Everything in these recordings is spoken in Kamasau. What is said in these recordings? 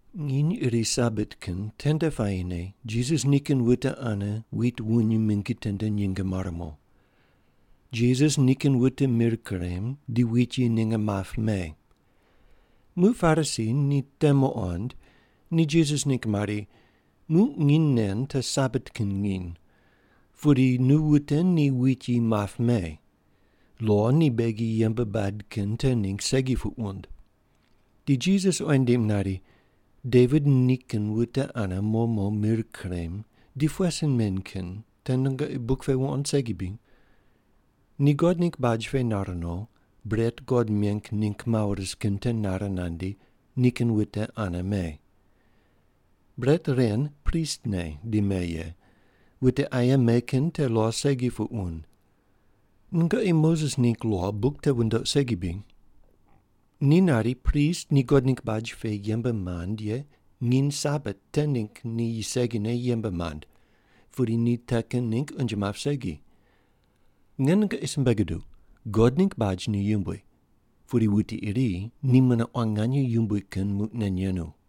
Nginy iri Sabat kin tende puayine Jisas nikin wute ane wit wuny mingi tende nyinge mare mo. Jisas nikin wute mir kurem, di wit yi ninge map me. Muq Parisi ni te muqond, ni Jisas ningg mari, “Muq nginy nen te Sabat kin nginy, pudi nu wute ni wit yi map me. Lo ni beghi yembe bad kin te ningg segi puq wund.” Di Jisas oyi nindim nari, “Devit nikin wute ane mo mo mir kurem di pughe sin men kin te nungoqi buk pe wuqond segi bri? Ni God ningg baj pe nar no, bret God meng ningg mawo ris kin te nare nandi, nikin wute ane me. Bret ren pristne di me ye, wute aye me kin te lo segi puq wund. Nungoqi Moses ningg lo buk te wundoq segi bri? Ni nari prist ni God ningg baj pe yembe mand ye nginy Sabat te ningg ni segine yembe mand, pudi ni te kin ningg unje map segi. Nge nungoqi simbe guduq, God ningg baj ni yumbui, pudi wuti iri ni mune quan nganye yumbui kin muq nen yenu.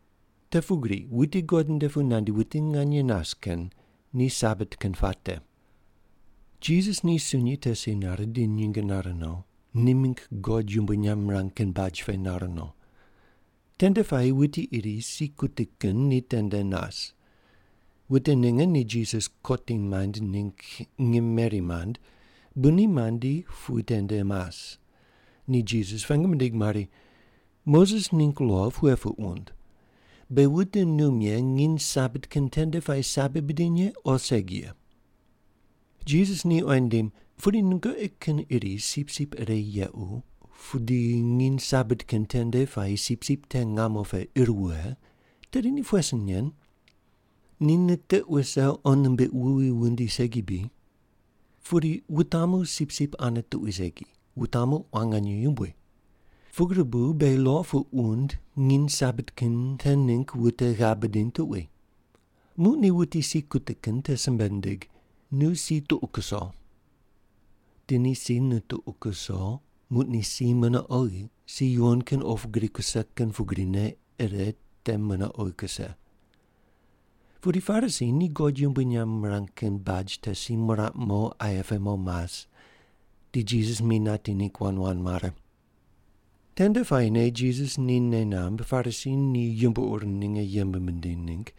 Te pugri wuti God nde pu nandi wuti nganye nas kin ni Sabat kin puate.” Jisas ni sunyi te si nare di nyinge nare no, ni mingg God yumbui nyamb mirang kin baj pe nar no. Tende puayi wuti iri si kuti kin ni tende nas. Wute ninge ni Jisas kotim maind ningg ngim meri mand bu ni mandi pu tende mas, ni Jisas pengu mindig mari, “Moses ningg lo pughe puq wund, beghi wute num ye nginy Sabat kin tende puayi sabi bidiny ye o segi ye?” Jisas ni oyi nindim, “Pudi nungoqi kin iri sipsip ire yequ pu di nginy Sabat kin tende puayi sipsip te ngamo pe ir wughe, tedi ni pughe sin nen? Ni nitiq wuse qo nimbiq wuwi wundi segi bri? Pudi wutamu sipsip ane tuqui segi, wutamu quan nganye yumbui. Pugri bu beghi lo puq wund nginy Sabat kin te ningg wute ghav bidiny tuqui.” Muq ni wuti si kuti kin te simbe nindig, “Nu si tuqu kuso.” Di ni si nituqu kuso, muq ni si mune oghi, si yuwon kin opu gri kuse kin pugrine ire te mune oghi kuse. Pudi Parisi ni God yumbui nyamb mirang kin baj te si miraq mo aye pe mo mas, di Jisas mi nati ningg wand wand mare. Tende puayine Jisas ni nei namb Parisi ni yumbo ur ninge yembe mindiny ningg,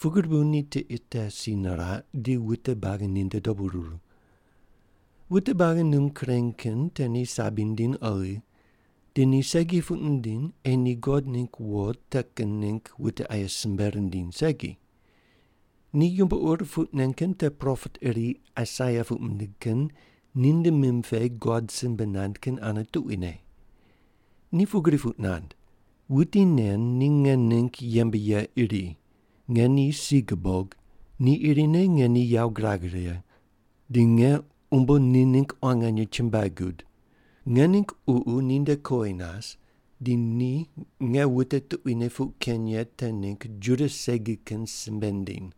pugri bu ni tiqe te si niraq, di wute buagi ninde dobu ruru. Wute buagi num kureny kin te ni sabi nindiny oghi, di ni segi puq nindiny ei ni God ningg wo te kin ningg wute aye simbe rindiny segi. Ni yumbo ur puq nen kin te propet iri Aisaia puq mindig kin ninde mim pe God simbe nand kin ane tuquine. Ni pugri puq nand: “Wuti nen ni nge ningg yembe ye iri, nge ni si gubog, ni irine nge ni yawo girag righe, di nge umbo ni ningg quan nganye chumbuai gud. Nge ningg ququ ninde kowi nas, di ni nge wute tuquine puq keny ye te ningg Juda segi kin simbe nindiny.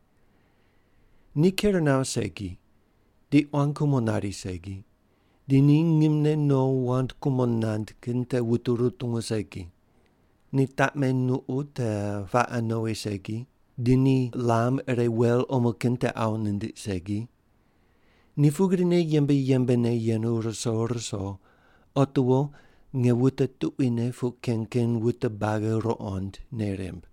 Ni ker nawo segi, di quan kumo nari segi, di ni ngimne no wand kumo nand kin te wute rutungu segi. Ni taqme nuqu te paqe nowi segi, di ni lam ire wel omo kin te awu nindiq segi. Ni pugrine yembe yembene yenu ruso ruso, otiwo nge wute tuquine puq keny kin wute buagi ruqond nei rimb.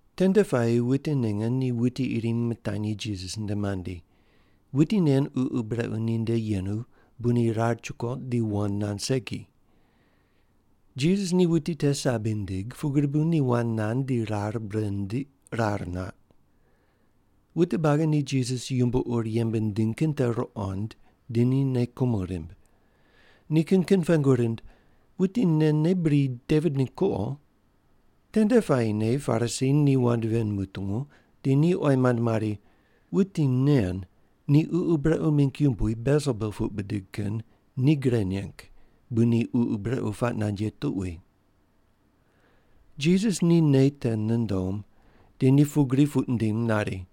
Tende puayi wute ninge ni wuti iri mitanyi Jisas nde mandi. Wuti nen ququ brequ ninde yenu, bu ni rar chukoq di wand nand segi. Jisas ni wuti te sabi nindig, pugri bu ni wand nand di rar bure nindiq, rar nat. Wute buagi ni Jisas yumbo ur yembe nindiny kin te ruqond, di ni nei kumo rimb. Ni kin kin pengu rind, “Wuti nen ne bri Devit ningg kuqo?” Tende puayine Parisi ni wand ven mutungu, di ni oyi mand mari, “Wuti nen ni ququ brequ mingg yumbui, Belsebul puq bidig kin, ni gre neng bu ni ququ brequ puaq nand ye tuqui.” Jisas ni nei te nundom, di ni pugri puq nindim nari,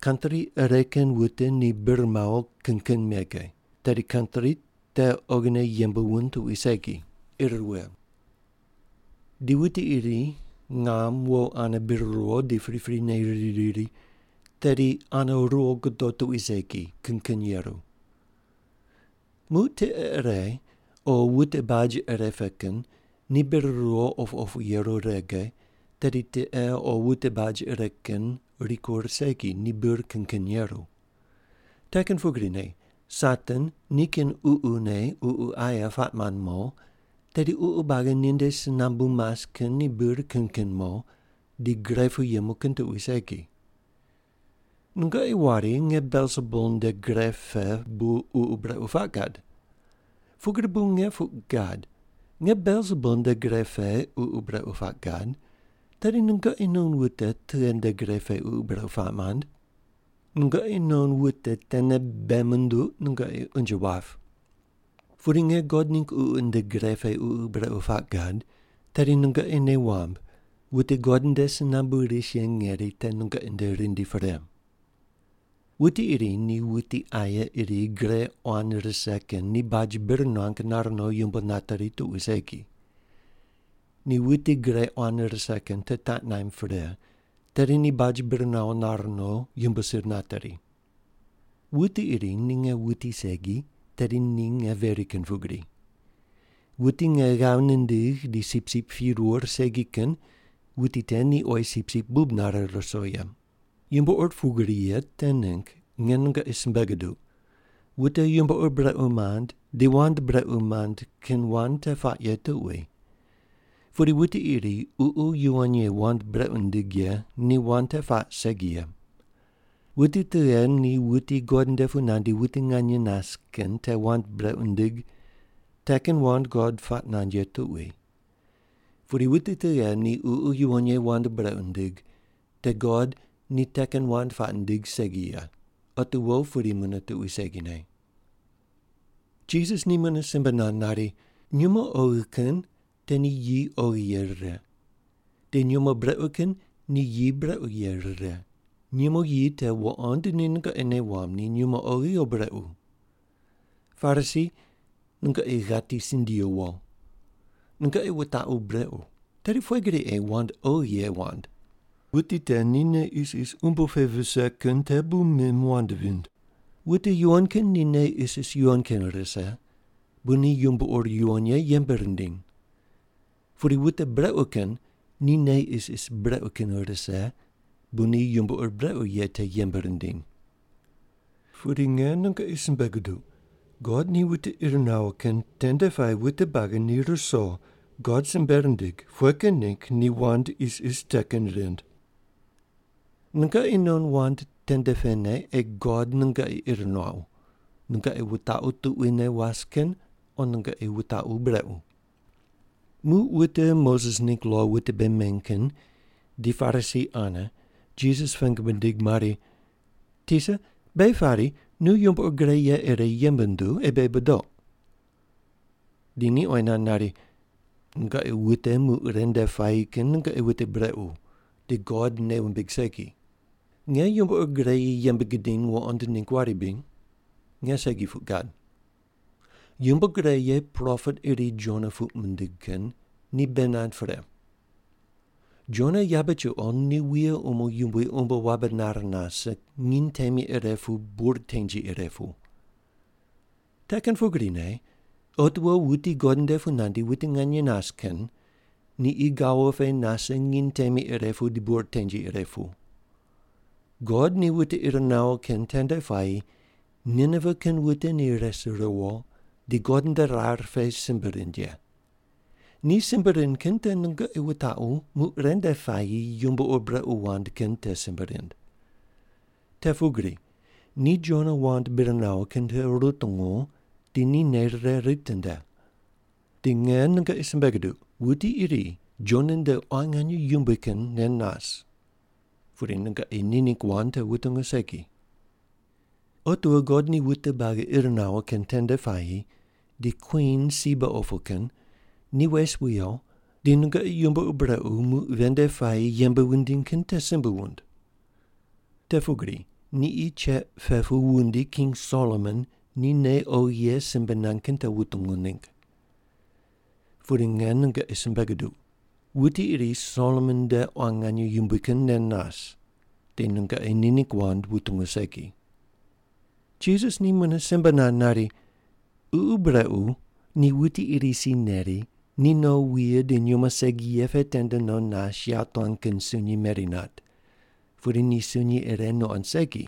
“Kantri ire kin wute ni bir mawo kin kin mege, tedi kantri te oghine yembe wund tuqui segi, ir wughe ye. Di wuti iri ngam wo ane bir ruwo di priprine riri riri, tedi ane ruwo gudo tuqui segi, kin kin yeru. Muq tiqe ire o wute baj ire pe kin ni bir ruwo opu opu yeru rege, tedi tiqe o wute baj ire kin rikur segi, ni bir kin kin yeru. Te kin pugrine Satan ni nikin ququne ququ aye puaq mand mo, tedi ququ buagi ninde si nambu mas kin ni bir kin kin mo, di gre pu yemu kin tuqui segi. Nungoqi wari nge Belsebul nde gre pe bu ququ brequ puaq gad. Pugri bu nge puq gad, nge Belsebul nde gre pe ququ brequ puaq gad, tedi nungoqi non wute tughe nde gre pe ququ brequ puaq mand? Nungoqi non wute tene bei munduq nungoqi unje wap. Pudi nge God ningg Ququ nde gre pe ququ brequ puaq gad, tedi nungoqi nei wamb wute God nde si nambu ris ye ngeri te nungoqi nde rindi pre. “Wuti iri ni wuti aye iri gre quan rise kin ni baj bir nuang nar no yumbo nateri tuqui segi. Ni wuti gre quan rise kin te taq naimb pre, tedi ni baj bir nawo nar no yumbo sir nateri. Wuti iri ni nge wuti segi, tedi ni nge veri kin pugri. Wuti nge ghav nindigh di sipsip pirur segi kin wuti te ni oyi sipsip bub nare ruso ye. Yumbo ur pugri ye te ningg nge nungoqi simbe guduq, wute yumbo ur brequ mand di wand brequ mand kin wand te puaq ye tuqui. Pudi wuti iri Ququ Yuwon Ye wand brequ nindig ye ni wand te puaq segi ye. Wuti tughe ni wuti God nde pu nandi wuti nganye nas kin te wand brequ nindig, te kin wand God puaq nand ye tuqui. Pudi wuti tughe ni Ququ Yuwon Ye wand brequ nindig, te God ni te kin wand puaq nindig segi ye. Otiwo pudi mune tuqui segine.” Jisas ni mune simbe nand nari, “Nyumo oghi kin te ni yi oghi ye rire. Di nyumo brequ kin te ni yi brequ ye rire, nyumo yi te wuqond di nungoqi nei wamb ni nyumo oghi o brequ. Parisi, nungoqi ghati sindiyu wo. Nungoqi wutaqu brequ, tedi pughe gri ei wand oghi ye wand? Wuti te ni nei isis umbo pe vise kin te bu mim wand vind. Wute yuwon kin ni nei isis yuwon kin rise, bu ni yumbo ur yuwon ye yembe rindiny. Pudi wute brequ kin ni nei isis brequ kin rise bu ni yumbo ur brequ ye te yembe rindiny. Pudi nge nungoqi simbe guduq, God ni wute ir nawo kin tende puayi wute buagi ni ruso God simbe rindig pughe kin ningg ni wand isis te kin rind. Nungoqi non wand tende pene ei God nungoqi ir nuaqu, nungoqi wutaqu tuquine was kin o nungoqi wutaqu brequ.” Muq wute Moses ningg lo wute bei meny kin di Parisi ane Jisas pengu mindig mari, “Tisa, beghi pari nu yumbo ur gre ye ire yembe nduw, ei beghi budoq.” Di ni oyi nand nari, “Nungoqi wute muq ren nde puayi kin nungoqi wute brequ, di God nei wumbig segi. Nge yumbo gre ye yembe gidiny wuqond ningg wari bri? Nge segi puq gad. Yumbo gre ye propet iri Jona puq mindig kin ni bei nand pre. Jona yabe chuqo ni wuye umo yumbui umbo wabe nar nase nginy temi ire pu bur tengi ire pu. Te kin pugrine otiwo wuti God nde pu nandi wuti nganye nas kin ni qi gawo pe nase nginy temi ire pu di bur tengi ire pu. God ni wute ir nawo kin tende puayi Ninive kin wute ni res riwo di God nde rar pe simbe rind ye. Ni simbe rind kin te nungoqi wutaqu muq ren nde puayi yumbo ur brequ wand kin te simbe rind. Te pugri ni Jona wand bir nawo kin te rutungu di ni nei rire ritinde. Di nge nungoqi simbe guduq, wuti iri Jona nde quan nganye yumbui kin nen nas. Pudi nungoqi ni ningg wand te wutungu segi. “Otiwo God ni wute buagi ir nawo kin tende puayi di Kwin Siba opu kin ni wes wiyo di nungoqi yumbo ur brequ muq ven nde puayi yembe wundiny kin te simbe wund. Te pugri ni qi cheq pe pu wundi King Solomon ni nei oghi ye simbe nand kin te wutungu ningg. Pudi nge nungoqi simbe guduq, wuti iri Solomon nde ni quan nganye yumbui kin nen nas, di nungoqi ni ningg wand wutungu segi.” Jisas ni mune simbe nand nari, “Ququ brequ ni wuti iri si neri, ni no wuye di nyumo segi ye pe tende no nas yawotuan kin sunyi meri nat, pudi ni sunyi ire nuqond segi,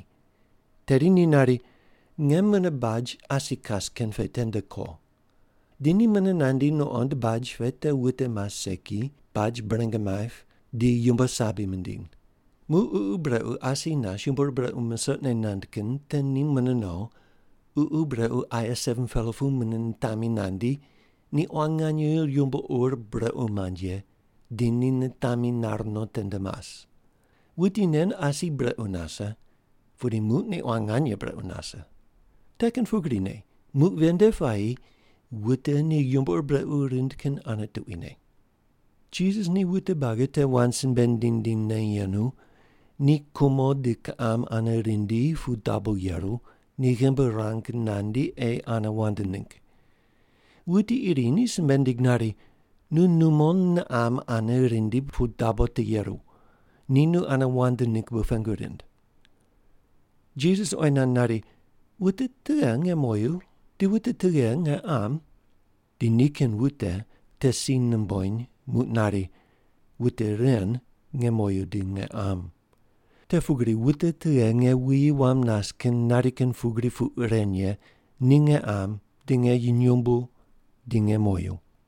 tedi ni nari, ‘Nge mune baj asi kas kin pe tende ko.’ Di ni mune nandi nuqond baj pe te wute mas segi, baj bureng maip, di yumbo sabi mindiny. Muq ququ brequ asi nas yumbo ur brequ musoqne nand kin te ni mune no, ququ brequ aye 7-pela pu mune nitami nandi, ni quan nganye yumbo ur brequ mand ye, di ni nitami nar no tende mas. Wuti nen asi brequ nase, pudi muq ni quan nganye brequ nase. Te kin pugrine muq ven nde puayi wute ni yumbo ur brequ rind kin ane tuquine.” Jisas ni wute buagi te wand simbe nindiny nindinyne yenu, ni kumo di kiqam ane rindi pu dabo yeru, ni ghimbi ruang nandi ei ane wand ningg. Wuti iri ni simbe nindig nari, “Nu numo niqam ane rindi pu dabo te yeru, ni nu ane wand ningg bu pengu rind.” Jisas oyi nand nari, “Wute tughe nge moyu di wute tughe nge qam?” Di nikin wute te si numbony muq nari, “Wute ren nge moyu di nge qam. Te pugri wute tughe nge wuyi wam nas kin nari kin pugri puq ren ye ni nge qam di nge nyumbu di nge moyu.”